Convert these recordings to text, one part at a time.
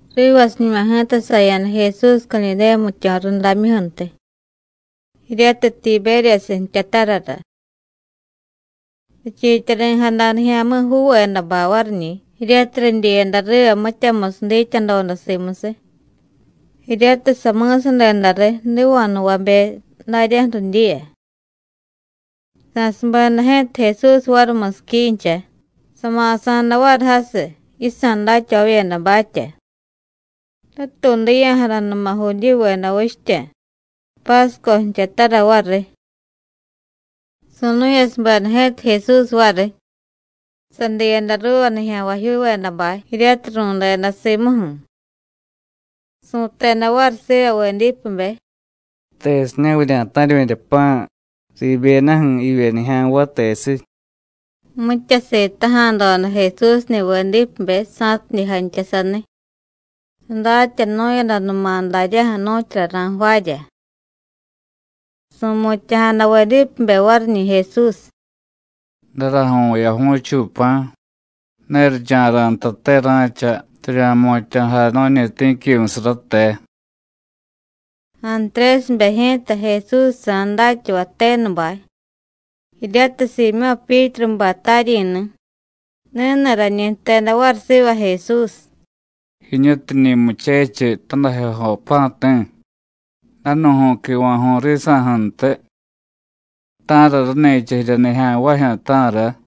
Rivasiñuma ji̱ta saya̱da Jesús Cadidéya jmityo̱ rudamyuju̱ntiy jiryatiy Tibéryasiy jtyatarara. Richiityari̱jada nijya̱mi̱juuvedabay variñi̱, jiryatiy ridyiyada riva mityamusiy dityadoda simusiy, jiryatiy sami̱sadeda riy jdiva̱jnuvabe daryaju̱ ridyiya. Sa̱subeda ji̱ta Jesús variy musiquincha, sama̱sa̱da variy jasiy yisa̱ datyavavyedabatya. Ratuudiya̱jadanuma Judíyuveda vichtya, Pásco jtyatara variy. Su̱nu̱yasubeda ji̱ta Jesús variy, sadiyada ruuva nijya̱nvajyuuvedabay jiryatiy ru̱deda simuju̱, su̱teda variy siva Vedípebe: “¿Tesiña̱ vurya̱ta̱ryu̱rya pa̱ riibyedaju̱ jivye nijya̱nvay, tesiy?” Mitya sitaja̱doda Jesúsni̱ Vedípebe sa̱tidye jantya saniy, sadatyanu̱yadanuma daryaju̱ nu̱tyura ra̱jvaarya. Su̱mutya̱jada Vedípebe variñi̱ Jesús: “Daraju̱y vu̱yaju̱chuy pa̱ ne richa̱ra̱ ntate ra̱cha rirya̱jmutya̱jay nu̱ñi ti̱quimusiy rate.” Antrésibe ji̱ta, Jesúsjsa̱ datyavay tenubay jiryatiy Siimyó̱ Pyítrubay taryi̱ni̱, ni̱ni̱ rañi jteda variy siva Jesús: “Jiñutiñi̱ muchechiy tadajyojo pa̱ti̱, danu̱ju̱y quiva̱ju̱y risa̱ju̱ntiy. ¿Ta̱ra rani̱cha jirya nijya̱nvajyu̱, ta̱ra?”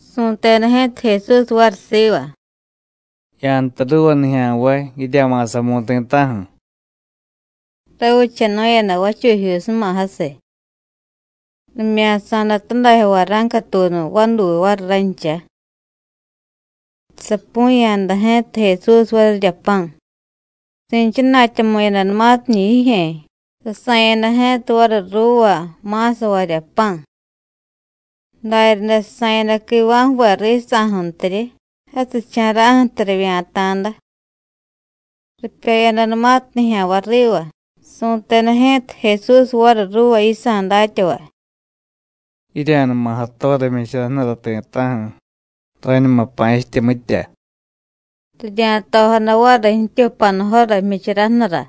Su̱teda ji̱ta Jesús variy siva: “Ya̱jtay ruuva nijya̱nvay: Jirya̱ma̱samu̱y ti̱ta̱ju̱.” Ravichanu̱yada vachujyuusuma jasiy. Rimya̱sa̱da tadajyo vara̱ncatuunu vaduy variy rancha. Sapu̱ya̱da ji̱ta Jesús varirya pa̱. Si̱chana̱tyamu̱yadanumatiñi̱ jijye̱, sasa̱yada ji̱ta variy ruuva ma̱savarya pa̱. Daryaday sasa̱yada quiva̱ jve risa̱ju̱ntiryi, jasicha̱ra̱ju̱tiy rivya̱ta̱da. Ripyoyadanumatiy nijya̱nvay riva, su̱teda ji̱ta Jesús variy ruuva yisa̱ datyavay: “Jirya̱numa jatora jmyichara jnura ti̱ta̱ju̱, rañuma pa̱chitye, mitya.” Rirya̱tojada variy jtyu panujora jmyichara jnura,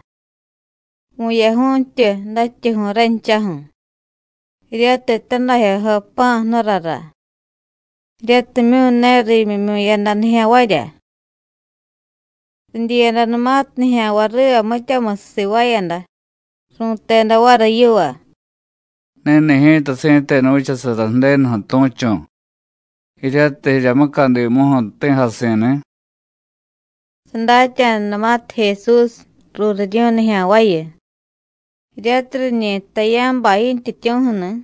vu̱yaju̱y jtyu dajtyuju̱y ranchaju̱, jiryatiy tadajyojo pa̱ jnurara, jiryatimyu̱ ne riimyimyu̱yada nijya̱nvarya. Ridyiyadanumatiy nijya̱nvay riva mityamusiy sivaayada, ru̱teda variy yiva: “Ni̱ni̱ ji̱ta si̱tenu vichasara Ju̱denuju̱ tu̱chu̱ jiryatiy jirya mucadimuju̱ jti̱jasi̱ni̱.” Sadatya̱danumatiy Jesús: ruuriryu̱y nijya̱nvayu, jiryatiy riñi jtay yá̱bay yintyityu̱ju̱ni̱,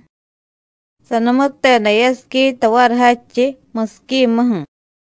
sanumuteda yasiquita variy jadchiy, musiquimuju̱.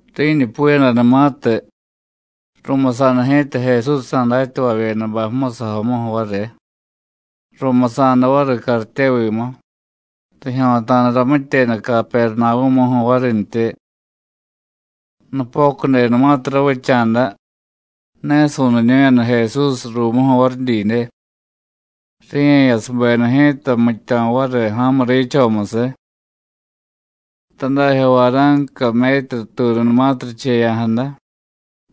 Ri̱ñupuyadanumatiy, ru̱musa̱da ji̱ta Jesúsjsa̱ datyavavyedabay musajomuju̱ variy, ru̱musa̱da variy cartyevimu, rijyo̱ta̱da ramityeda Capernavú̱muju̱ varintyi. Nupocudenumatiy ravicha̱da, ne su̱niñu̱yada Jesús ruumuju̱ variy didye. Ri̱ye̱yasubeda ji̱ta jmityo̱ variy ja̱mu riichomusiy. Tadajyo vara̱nca metru tuununumatiy richeya̱jada,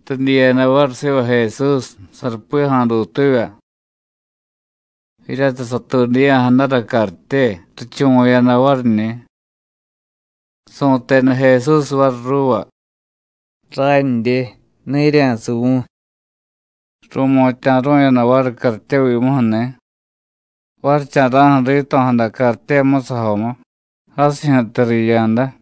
ridyiyada variy siva Jesús sarupi ja̱a̱dutuvya. Jiryatiy satuudiya̱jadara cartye, richuvu̱yada variñi̱. Su̱teda Jesús variy ruuva: “Randye, ne jirya̱suvu̱y.” Ru̱mutya̱ru̱yada variy cartyevimuju̱ni̱. Varicha̱ra̱ju̱ rito̱jada cartye musajomu, jasijyu̱tiy riya̱da.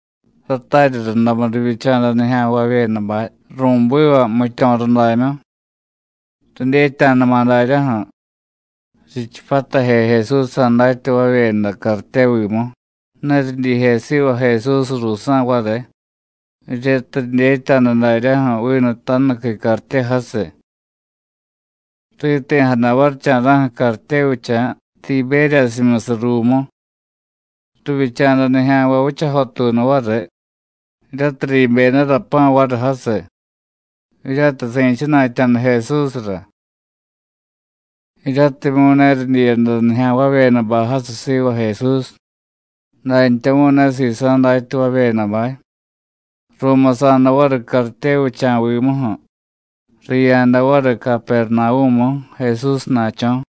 Ratarya rundamu rivyicha̱da nijya̱nvavyedabay ru̱biva jmityo̱ rudamyu. Ridyetya̱dama̱ daryaju̱ richipyataje Jesúsjsa̱ datyavavyeda cartyevimu, ne ridyije siva Jesús ruusa̱ variy, jiryatiy ridyetya̱da daryaju̱ vinu tajnuqui cartye jasiy. Riti̱jada varicha̱ra̱ju̱ cartyevicha̱ Tibéryasimyusiy ruumu. Rivyicha̱da nijya̱nvay vichajotuunu variy jiryatiy riibyedara pa̱ variy jasiy, jiryatiy si̱chana̱tya̱da Jesúsra. Jiryatimyu̱ ne ridyiyada nijya̱nvavyedabay jasiy siva Jesús, dantyamu̱y ne sisa̱ datyavavyedabay, ru̱musa̱da variy cartyevicha̱vimuju̱, riya̱da variy Capernavú̱mu, Jesúsna̱cho̱.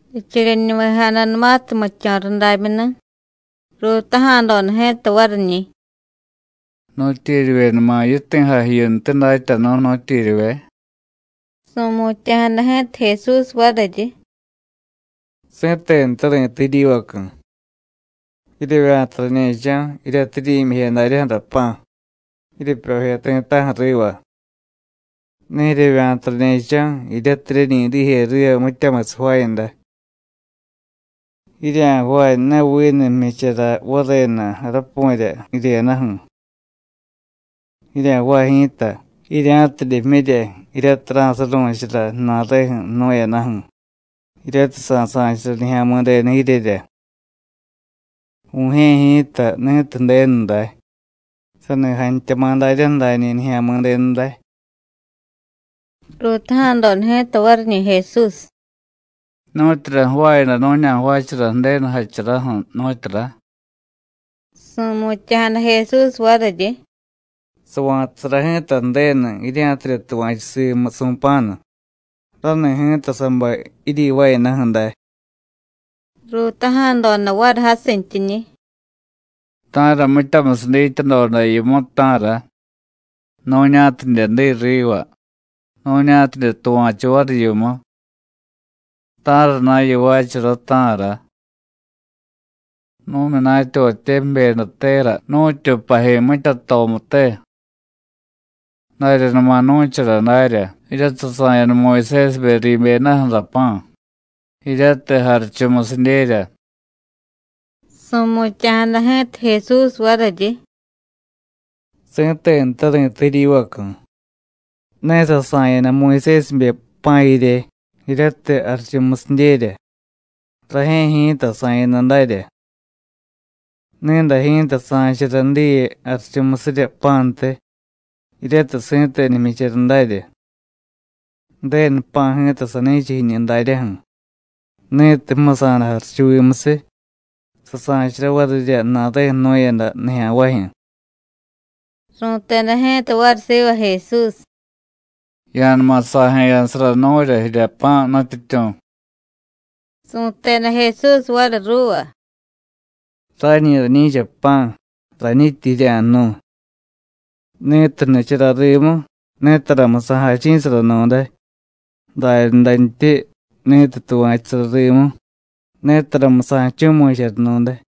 Richeryenuvejadanumatiy jmityo̱ rudamyuni̱, ruutaja̱doda ji̱ta variñi̱: “¿Nu̱tyeryivyenuma yiti̱jay jiyuntiy, Datyanu̱, nu̱tyeryivye?” Su̱mutya̱jada ji̱ta Jesús variryi: “Si̱tenute ri̱tay jiryivacu̱: Jiryevya̱ta rañe̱cho̱ jiryatiy jiryi̱myije daryaju̱ra pa̱, jiryepyoje ti̱ta̱ju̱ riva. Ne jiryevya̱ta rañe̱cho̱ jiryatiy jiryeñi dije riva mityamusiy jvaayada. Jirya̱jvaay, ne vinu jmyichara varenu jarapu̱rya jiryedaju̱. Jirya̱jvaay ji̱ta jirya̱tidye jmyirya jiryatiy ra̱suru̱chara ju̱na̱reju̱ jnu̱yadaju̱, jiryatiy sa̱sa̱chara Nijya̱mi̱denu jiryerya. Vu̱jye̱ ji̱ta ni̱tiy Ju̱denu day, sani jantyama̱ daryaju̱ dañi̱ Nijya̱mi̱denu day.” Ruutaja̱doda ji̱ta variñi̱ Jesús: “¿Nu̱tyura jvaayada nu̱ña̱jvaachara Ju̱denu jacharaju̱, nu̱tyura?” Su̱mutya̱jada Jesús variryi: “Sava̱tasara ji̱ta Ju̱denu jirya̱tidye tuva̱chu simu su̱pa̱nu. Rani̱ ji̱ta sabay jiryivaayadaju̱ day.” Ruutaja̱doda variy jasintyiñi̱: “¿Ta̱ra mityamusiy dityadoda yimu, ta̱ra? nu̱ña̱tidye diy riva, nu̱ña̱tidye tuva̱chu variy yimu. ¿Ta̱rana̱ yivaachara, ta̱ra? Nu̱myunatyavatye jbyedatera nu̱tyu paji mityatomute. Daryanuma nu̱chara darya, jiryatiy sasa̱yada Muyusésibe riibyedaju̱ra pa̱ jiryatiy jarichumusidyerya.” Su̱mutya̱jada ji̱ta Jesús variryi: “Si̱tenute ri̱tay jiryivacu̱: Ne sasa̱yada Muyusésibe pa̱ jirye, jiryatiy jarichumusidyerya, rajye̱ ji̱ta sa̱yada darya. Ni̱day ji̱ta sa̱chara diye jarichumusirya pa̱ntiy, jiryatiy si̱tenu jmyichara darya. Ju̱denu pa̱ ji̱ta sani̱cha jiñu daryaju̱, ni̱tiy jmusa̱da jarichuvimusiy, sasa̱chara varirya ju̱na̱reju̱ jnu̱yada nijya̱nvajyu̱.” Ru̱teda ji̱ta variy siva Jesús: “Ya̱numa sa̱jeya̱sara nu̱rya jirya pa̱, Nutyityu̱.” Su̱teda Jesús variy ruuva: “Rañi rañi̱cha pa̱ rañityi jirya̱jnu̱y. Ni̱tiy jnichara rimu, netaramu sa̱jachi̱saranu̱day, daryadantyi ni̱tiy tuva̱chusara rimu, netaramu sa̱jchu̱mu̱charanu̱day.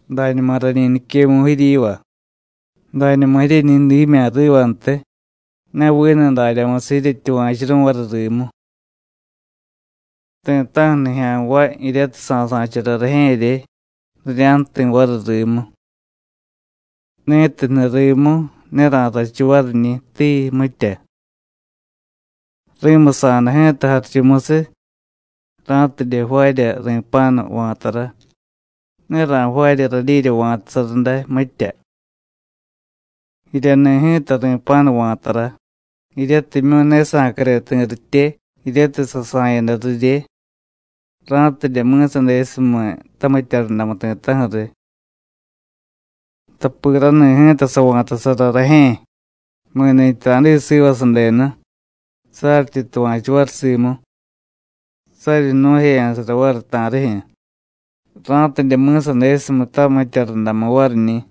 Dañuma rañi niquemu̱y jiryiva: Dañuma jiryeñi dimya̱ rivantiy, ne vinu daryamusiy jiryetyuva̱churu̱y variy rimu. Ti̱ta̱ju̱ nijya̱nvay jiryatiy sasa̱chara rajye̱rye, rirya̱jti̱ variy rimu. Ni̱tiy jniy rimu, ne ra̱rrachu variñi̱, tii, mitya. Ri̱musa̱da ji̱ta jarichumusiy ra̱tidye jvaarya ri̱pa̱nu va̱tara, ne ra̱jvaarya radyirya va̱tasara day, mitya. Jiryani̱ ji̱ta ri̱pa̱nu va̱tara, jiryatimyu̱ ne sa̱care ti̱ ritye jiryatiy sasa̱yada rirye, ra̱tidye mi̱sadesumiy tamitya rundamu ti̱ta̱ju̱ riy. Tapi rani̱ ji̱ta sava̱tasara rajye̱, mi̱ni̱tyi ra̱diy siva sadenu, saryityi tuva̱chu variy simu, saryi jnu̱jeya̱sara variy ta̱rijyu̱, ra̱tidye mi̱sadesumiy tamitya rundamu variñi̱.”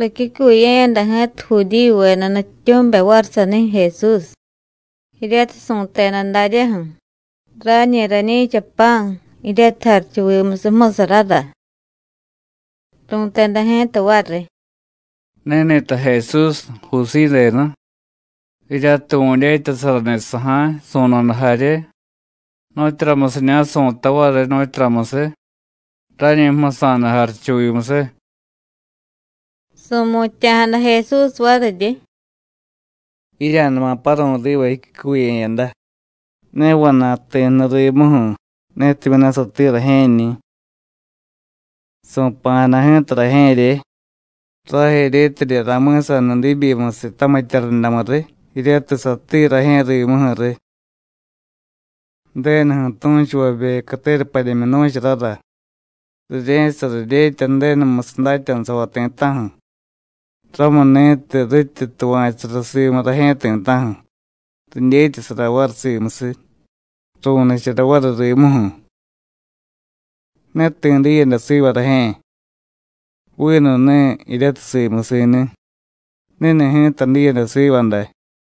Ricyucuye̱yada ji̱ta Judíyuveda nutyityu̱mibe variy sanijyu̱ Jesús, jiryatiy su̱teda daryaju̱: “Rañi rañi̱cha pa̱ jiryatiy jarichuvimusiy jmusarara.” Ru̱teda ji̱ta variy: “¿Ni̱ni̱ta Jesús, Jusíy denu, jiryatiy vu̱dyetyasarani̱ saja̱y, su̱no̱da jarye? ¿Nu̱tyuramusiña̱ su̱tay variy, nu̱tyuramusiy? rañi jmusa̱da jarichuvimusiy.” Su̱mutya̱jada Jesús variryi: “Jirya̱numa paru̱y riva jiccuye̱yada. Ne vana̱y ti̱ jniy rimuju̱, netimyu̱ ne satiiy rajye̱ñi̱. Su̱pa̱jada ji̱ta rajye̱rye, rajeryetidye ra̱mi̱saniy diibyimusiy tamitya rundamu riy jiryatiy satiiy rajye̱ rimuju̱ riy. Ju̱denuju̱ tu̱chuvabe catera padyemyu nu̱charara: Rirye̱chasara dyetya Ju̱denumusiy datyanusavay ti̱ta̱ju̱. Ramuni̱tiy rityi tuva̱chusara simu rajye̱ ti̱ta̱ju̱, ridyetyasara variy simusiy, ru̱nichara variy rimuju̱. Ne ti̱ diyada siva rajye̱, vinu ni̱ jiryatiy simusi̱ni̱, ni̱ni̱ ji̱ta diyada siva day.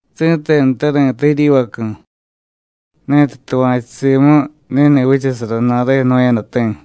Si̱tenute ri̱tay jiryivacu̱: Ni̱tiy tuva̱chu simu, ni̱ni̱ vichasara ju̱na̱reju̱ jnu̱yadati̱.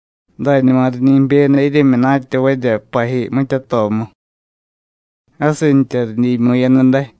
Dañuma riñi jbyeda jiryemyunatyavarya paji mityatomu, jasintya ridyiimyu̱yada day.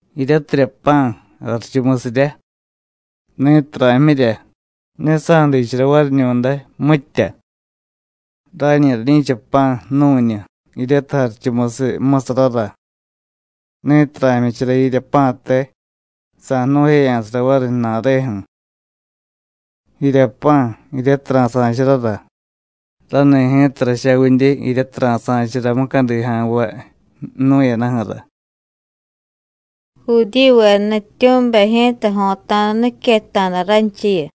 Jiryatirya pa̱ jarichumusiryá. Ni̱tiy ra̱jmyirya, ne sa̱diichara variñu̱day, mitya. Rañi rañi̱cha pa̱ ju̱nu̱ñu, jiryatiy jarichumusiy jmusarara. Ni̱tiy ra̱jmyichara jirya pa̱te, sa̱jnu̱jeya̱sara variy ju̱na̱reju̱. Jirya pa̱, jiryatiy ra̱sa̱charára, rani̱ ji̱ta rachavidye jiryatiy ra̱sa̱chara mucadi ja̱nvay jnu̱yadaju̱ra.” Judíyuveda nutyityu̱mibe ji̱ta jo̱ta̱da niquetta̱da ranchiyu: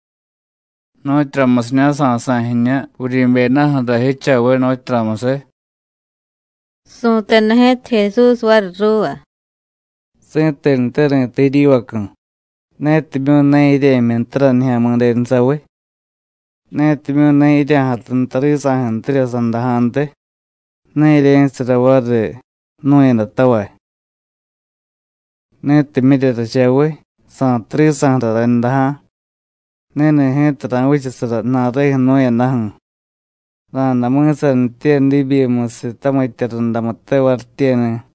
“¿Nu̱tyuramusiña̱ sa̱sa̱y jiñu vuryi̱byedaju̱ra jichaviy, nu̱tyuramusiy?” Su̱teda ji̱ta Jesús variy ruuva: “Si̱tenute ri̱tay jiryivacu̱: Netimyu̱ ne jirye̱jmyi ntara Nijya̱mi̱denu saviy, netimyu̱ ne jirya̱jatu nta risa̱ju̱ntirya sandaja̱ntiy, ne jirye̱chasara variy jnu̱yadatavay. Ni̱tiy jmyirya rachaviy, sa̱tu risa̱ju̱ra rayndaja̱, ni̱ni̱ ji̱ta ra̱vichasara ju̱na̱reju̱ jnu̱yadaju̱, ra̱day mi̱sanitye diibyimusiy tamitya rundamute varityeni̱.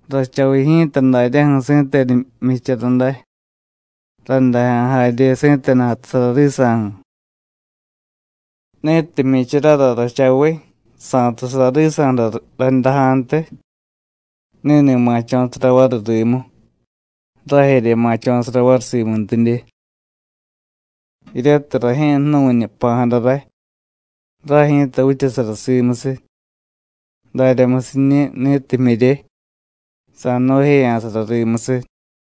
Rachaviy ji̱ta daryaju̱ si̱tenu jmyichara day, rayndaja̱ jarye si̱tenu jatusara risa̱ju̱. Ni̱tiy jmyicharara rachaviy, sa̱tusara risa̱ju̱ra rayndaja̱ntiy, ni̱ni̱ ma̱cho̱sara variy rimu, rajerye ma̱cho̱sara variy simuntidye. Jiryatiy rajye̱ jnu̱ñu jpa̱jada ray, ray ji̱ta vichasara simusiy. Daryamusiñi̱, ni̱tiy jmyirye, sa̱jnu̱jeya̱sara rimusiy.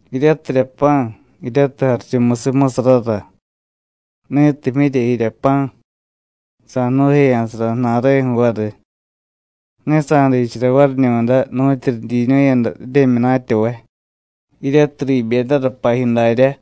Jiryatirya pa̱, jiryatiy jarichumusiy jmusarara. Ni̱tiy jmyirya jirya pa̱, sa̱jnu̱jeya̱sara ju̱na̱reju̱ variy, ne sa̱diichara variñu̱day nu̱tyu ridyiiñu̱yada jiryemyunatyavay, jiryatiy riibyedara paji daryá.”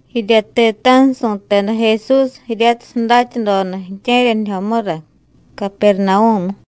Jirya ti̱ta̱ju̱ su̱teda Jesús jiryatiy sadatyadoda ju̱tye̱ryanijyomura, Capernavú̱mu.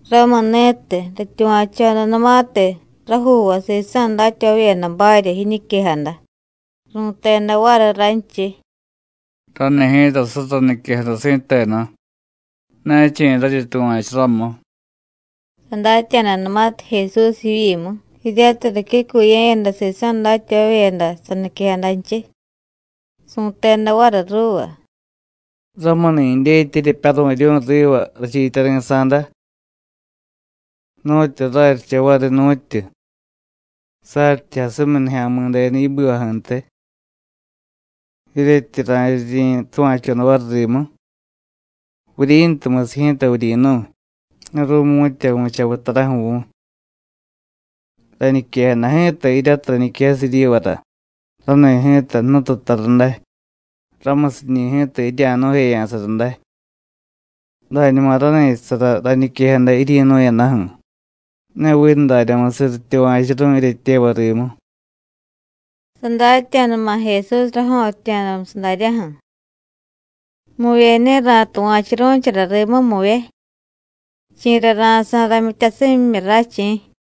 Ramuni̱tiy, rityuva̱chodanumatiy rajuuvay sisa̱ datyavavyedabarya jiñiquejada, ru̱teda variy ranchiy: “Rani̱ ji̱ta surra niquejada si̱tenu: ne chi̱ raryi tuva̱chu ramu.” Sadatya̱danumatiy Jesús jivyimu jiryatiy ricyucuye̱yada sisa̱ datyavavyeda saniquejadanchiy, su̱teda variy ruuva: “¿Ramuni̱ dyetya jiryepyaru̱ryu̱y riva rachiityari̱sa̱da? ¿Nu̱tyu raryicha variy, nu̱tyu? saryityi jasumiy Nijya̱mi̱denu yibivaju̱ntiy. ¿Jiryetyi ra̱ryiryi̱ tuva̱choda variy rimu? Vuryi̱ntumusiy ji̱ta vuryi̱nu̱y, ne ru̱mu̱tya vu̱chaviy taraju̱ vu̱y. Rañiquejada ji̱ta jiryatiy rañiquejasiy jiryivara, rani̱ ji̱ta jnututara day, ramusiñi̱ ji̱ta jirya̱jnu̱jeya̱sara day. Dañuma rani̱chasara rañiquejada jiryi̱nu̱yadaju̱, ne vinu daryamusiy rityuva̱churu̱y jiryetyevay rimu.” Sadatya̱dama̱ Jesús rajo̱ttya̱musiy daryaju̱: “Muvye ne ra̱tuva̱churu̱chara rimu, muvye; chi̱ra ra̱sa̱y ramyityasimyimyu ray, chi̱.”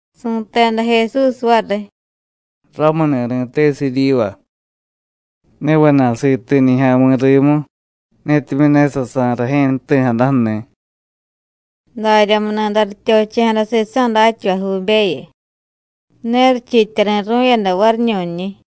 Su̱teda Jesús variy: “Ramuni̱ ri̱tesiy jiryiva: Ne vana̱y siti̱ nijya̱mi̱ rimu, netimyu̱ ne sasa̱y rajye̱ jti̱jadaju̱ni̱.” Daryamuni̱day rityochiya̱jada sisa̱ datyavajyuubeyu, ne richiityari̱ru̱yada variñu̱nñi̱.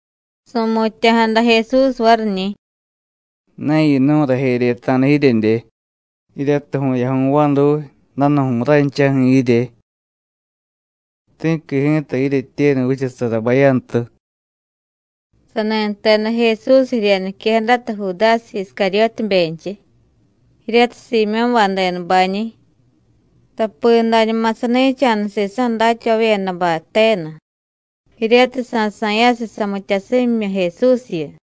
Su̱mutya̱jada Jesús variñi̱: “¿Ne yinu̱y rajeryeta̱da jiryedye, jiryatiy vu̱yaju̱y vaduy, danu̱ju̱y ranchaju̱ jirye? Ti̱qui ji̱ta jiryetyenu vichasara bayantu.” Sani jteda Jesús jirya niquejadata Judásiy Iscaryótibenchiy, jiryatiy Siimyó̱bay denubañi̱. Tapi dañuma sani̱cha̱da sisa̱ datyavavyedabay tenu, jiryatiy sa̱sa̱yasiy samityasimyimyu Jesúsyu.